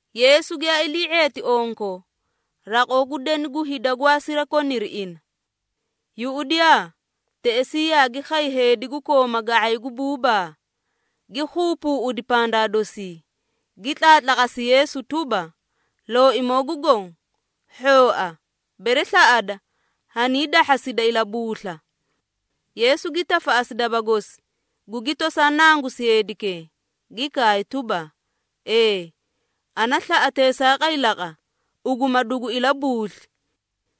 Yeesu giyaa ilii⁄eeti onko, raqoo gu deni gu hida gwaa sirakoniri ina. Yuꞌudiyaa! Teꞌesii yaagi khay heedi gu kooma ga⁄ay gu buubaa, gi keebeeꞌedi pandaa dosii, gi tlaatlaqasi Yeesu tuba, “Looimoo gu Goõ, hhooa, bere slaꞌada, haniidahhasida ilabuusla.” Yeesu gi tafaꞌasi daba gosi, gugi tosaa nangusi heedikee, gi kaay tuba, “Ee, Ana slaꞌa teesaaqay laqa, ugu ma dugu ilabuusli!”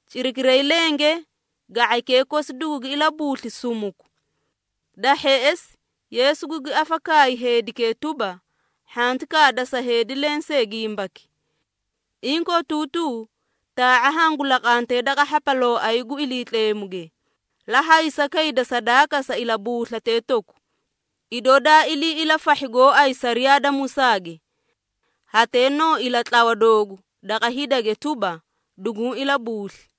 Cirakiray lenge ga⁄aykee kosi dugugi ilabuusli sumuku! Da hheꞌesi, Yeesu gugi afakaayi heedikee tuba, “Hhanti kaada sa heedi lensee gimbaki. Inkootuutuu taa⁄a hangu laqante daqa hhapalooay gu Iliitleemuge, la haysa kayda sadaaka sa ilabuuslatee toku, idoo daa ilii ilafahhi gooay sariyaa da Musaage. Hatee noo ilatlawa doogu daqa hidage tuba, duguũ ilabuusli.”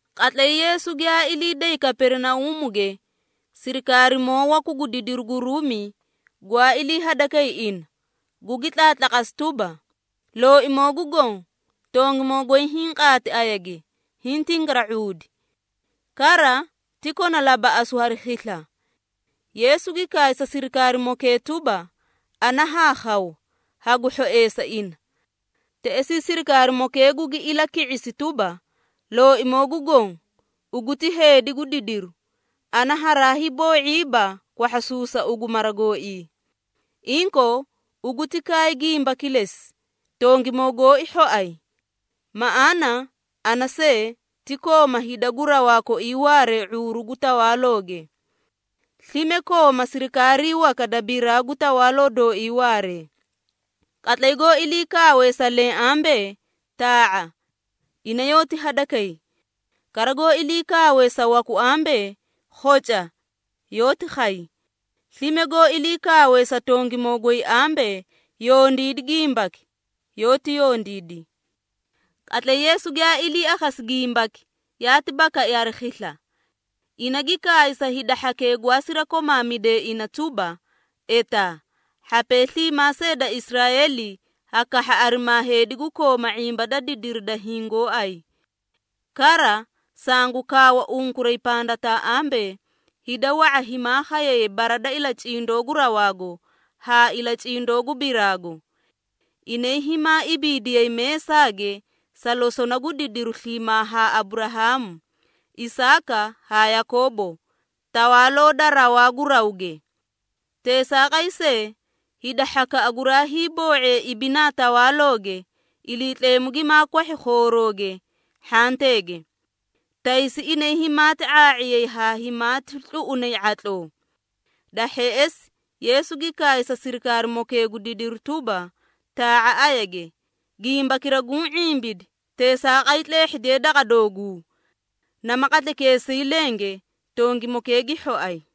Qatlay Yeesu giyaa ilii day Kaperinauumuge, sirikaarimoo waku gu didiru gu Ruumi, gwaa ilii hadakay ina, gugu tlaatlaqasi tuba, “Looimoo gu Goõ, tongimoo goy hiĩ qaati ayage, hiĩ tingara⁄uudi. Kara, ti kona labaꞌasu hari khisla.” Yeesu gi kaay sa sirikaarimokee tuba, “Ana haa khaw, hagu hhoeesa ina.” Teꞌesii sirikaarimokee gugi ilaki⁄isi tuba, “Looimoo gu Goõ, ugu ti heedi gu didiru, ana haraa hiiboo⁄iiba kwahhasuusa ugu mara gooii. Inkoo, ugu ti kaay gimba kilesi, tongimoo gooi hhoay! Maꞌaana, ana see, ti kooma hida gu rawaa koii waaree ⁄uuru gu tawaalooge. Slime kooma sirikaarii waka da biraa gu tawaaloo dooii waaree. Qatlay goó ilii kaawe sa leẽ ambee, ‘Taa⁄a!’ Ina yoóti hadakay. Kara goó ilii kaawe sa waku ambee, ‘Khoca!’ Yoóti khay. Slime goó ilii kaawe sa tongimoo goy ambee, ‘Yondiidi gimbaki!’ Yoóti yondiidi.” Qatlay Yeesu giyaa ilii akhasi gimbaki, yaati bakai hari khisla. Ina gi kaay sa hida hhakee gwaa sirakomaamidee ina tuba, “Etaa, hhapee sliimaa see da Israeeli ha kahha arimaa heedi gu kooma ⁄imba da didiri da hiĩ gooay! Kara, sangu kaawa unkuray pandataa ambee, hida wa⁄a himaa khayay bara da ilacindoo gu rawaago haa ilacindoo gu biraago. Inay himaa ibiidiyay meesaage sa losona gu didiru sliimaa haa Aburahaamu, Isaaka haa Yakoobo Tawaaloo da rawaa gu rawge. Teesaaqay see, hida hhakaꞌa guraa hiiboo⁄ee ibinaa Tawaalooge, Iliitleemu gimaa kwahhi khoorooge, hhanteege. Taysi inay himaati ⁄aa⁄iyay haa himaati tluꞌunay ⁄atloo.” Da hheꞌesi, Yeesu gi kaay sa sirikaarimokee gu didiru tuba, “Taa⁄a ayage, gimbakira guũ ⁄imbidi teesaaqay tleehhidiye daqa dooguu.” Nama qatlaykeesii lenge tongimokee gi hhoay.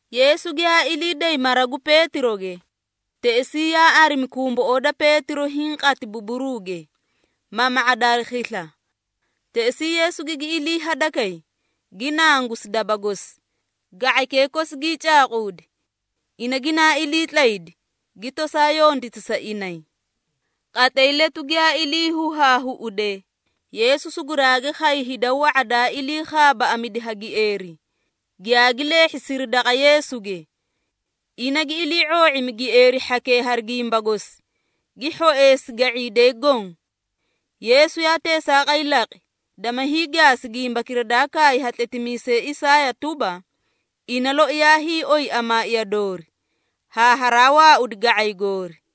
Yeesu giyaa ilii day mara gu Peetiroge, teꞌesii yaa arimi kumboꞌoo da Peetiro hiĩ qati buburuuge, mama⁄ada hari khisla. Teꞌesii Yeesu gigi ilii hadakay, gi nangusi daba gosi, ga⁄aykee kosi gii caaquudi. Ina ginaa iliitlaydi, gi tosaa yonditi sa inay. Qatlay letu giyaa ilii huhaahuꞌude, Yeesu suguraagi khay hida wa⁄a daa ilii khaabaaꞌamidi ha gieeri, giyaagi leehhisiri daqa Yeesuge. Ina gi ilii⁄oo⁄imi gieeri hhakee hari gimba gosi, gi hhoeesi ga⁄iidee goõ. Yeesu yaa teesaaqay laqi, dama hiigaasi gimbakira daa kaay ha tletimiisay Isaaya tuba, “Ina loi yaa hiioy amaaiya doori, haa haraa waaudi ga⁄ay goori.”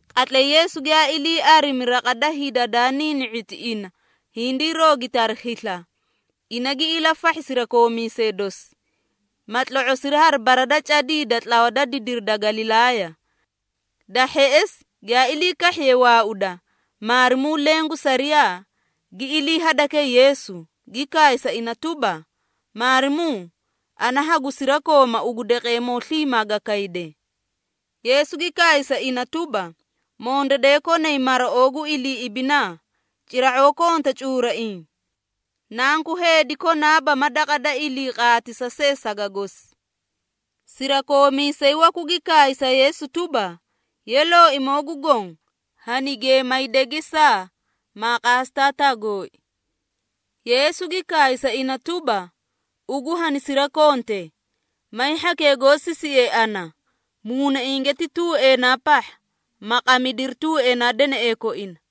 Qatlay Yeesu giyaa ilii arimi raqa da hida daa niini⁄iti ina hindii roogiti hari khisla, ina gi ilafahhi sirakoomiisee dosi, ma tlo⁄osiri hari bara da cadii da tlawa da didiri da Galilaaya. Da hheꞌesi, giyaa ilii kahhiyee waauda, maarimuu leẽ gu sariyaa, gi ilii hadakay Yeesu, gi kaay sa ina tuba, “Maarimuu, ana hagu sirakooma ugu daqeemoo sliimaa ga kayde!” Yeesu gi kaay sa ina tuba, “Mondadee konay maraoo gu ilii ibinaa, cira⁄oo konta cuuraiĩ. Nanku Heedi konaaba ma daqa da ilii qaatisa see saga gosi.” Sirakoomiisay waku gi kaay sa Yeesu tuba, “Ye, Looimoo gu Goõ, hani geemayde gesaa, maa qaasi taataa gooi.” Yeesu gi kaay sa ina tuba, “Ugu hanisirakonte, may hhakee goó sisiee ana, muunainge ti tuueenaa pahha, ma qamidiri tuueenaa deneꞌee koina.”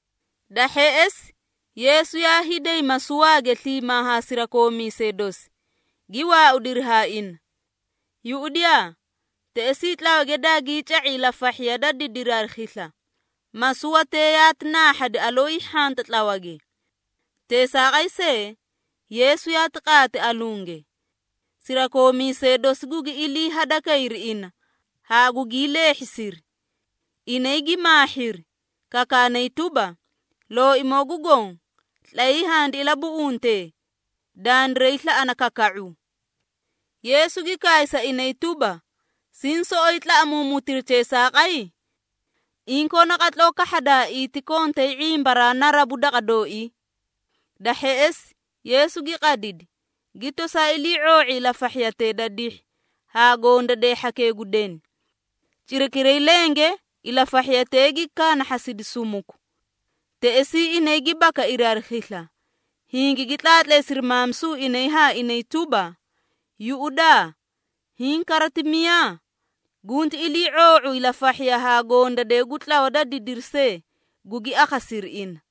Da hheꞌesi, Yeesu yaa hiiday masuwaage sliimaa haa sirakoomiisee dosi, gi waaudiri haa ina. Yuꞌudiyaa! Teꞌesii tlawage daagii ca⁄i ilafahhiya da didiri hari khisla, masuwatee yaati naahhadi aloo hiihhanta tlawage. Teesaaqay see, Yeesu yaati qaati alunge. Sirakoomiisee dosi gugi ilii hadakayri ina haa gugii leehhisiri. Inay gi maahhiri, kakaanay tuba, “Looimoo gu Goõ, tlayii handi ilabuꞌunte! Dandiray slaꞌana kaka⁄u!” Yeesu gi kaay sa inay tuba, “Siĩ soꞌoyi tlaꞌamuumutiri teesaaqay? Inkoo naqatloo kahhadaaii, ti kontay ⁄imbaraa narabu daqa dooii!” Da hheꞌesi, Yeesu gi qadidi, gi tosaa ilii⁄oo⁄i ilafahhiyatee da dihhi haa gondadee hhakee gu deni. Cirakiray lenge ilafahhiyatee gi kaanahhasidi sumuku. Teꞌesii inay gi bakairi hari khisla, hingigi tlaatleesiri maamisu inay haa inay tuba, “Yuꞌudaa! Hiĩ kara ti miyaa? Gunti ilii⁄oo⁄u ilafahhiya haa gondadee gu tlawa da didiri see, gugi akhasiri ina.”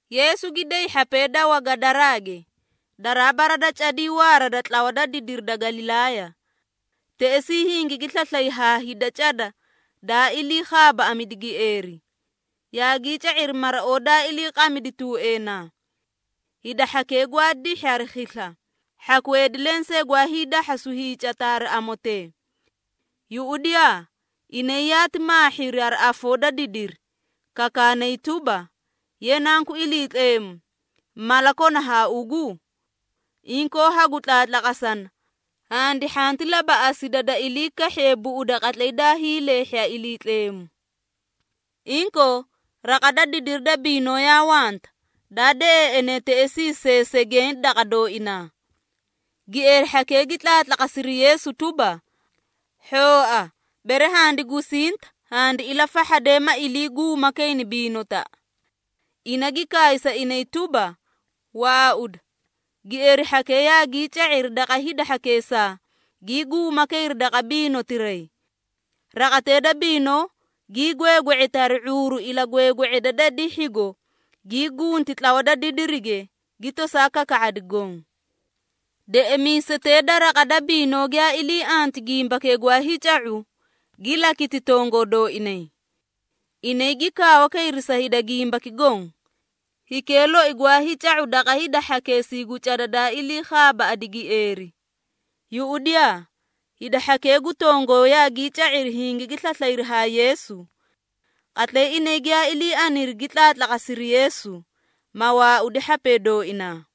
Yeesu gi day hhapee da Wagadaraage, daraa bara da cadii waara da tlawa da didiri da Galilaaya. Teꞌesii hingigi slaslay haa hida cada daa ilii khaabaaꞌamidi gieeri, yaagii ca⁄iri maraoo daa iliiqamidi tuueenaa. Hida hhakee gwaa dihhi hari khisla, hhaku heedi lensee gwaa hiidahhasu hiicata hari amotee. Yuꞌudiyaa! Inay yaati maahhiri hari afoo da didiri, kakaanay tuba, “Ye, Nanku Iliitleemu, mala kona haa ugu? Inkoo, hagu tlaatlaqasana, handi hhanti labaꞌasida da ilii kahhiye buꞌuda qatlay daa hiileehhi ha Iliitleemu!” Inkoo, raqa da didiri da biinoo yaa wanta, daa deꞌeeꞌene teꞌesii seesegeẽ daqa dooinaa. Gieeri hhakee gi tlaatlaqasiri Yeesu tuba, “Hhooa, bere handi gusinta, handi ilafahhade, ma iliiguuma kayni biinotaꞌa.” Ina gi kaay sa inay tuba, “Waauda!” Gieeri hhakee yaagii ca⁄iri daqa hida hhakeesaa, gii guuma kayri daqa biinotiray. Raqatee da biinoo, gii gweegwe⁄eti hari ⁄uuru ilagweegwe⁄eda da dihhigo, gii gunti tlawa da didirige, gi tosaa kaka⁄adi goõ. Deꞌemiisetee da raqa da biinoo giyaa ilii anti gimbakee gwaa hiica⁄u, gi lakiti tongoo dooinay. Inay gi kaawa kayri sa hida gimbaki goõ, hikee loi gwaa hiica⁄u daqa hida hhakeesii gu cada daa ilii khaabaaꞌadi gieeri. Yuꞌudiyaa! Hida hhakee gu tongoo yaagii ca⁄iri hingigi slaslayri haa Yeesu. Qatlay inay giyaa ilii aniri gi tlaatlaqasiri Yeesu, ma waaudi hhapee dooinaa!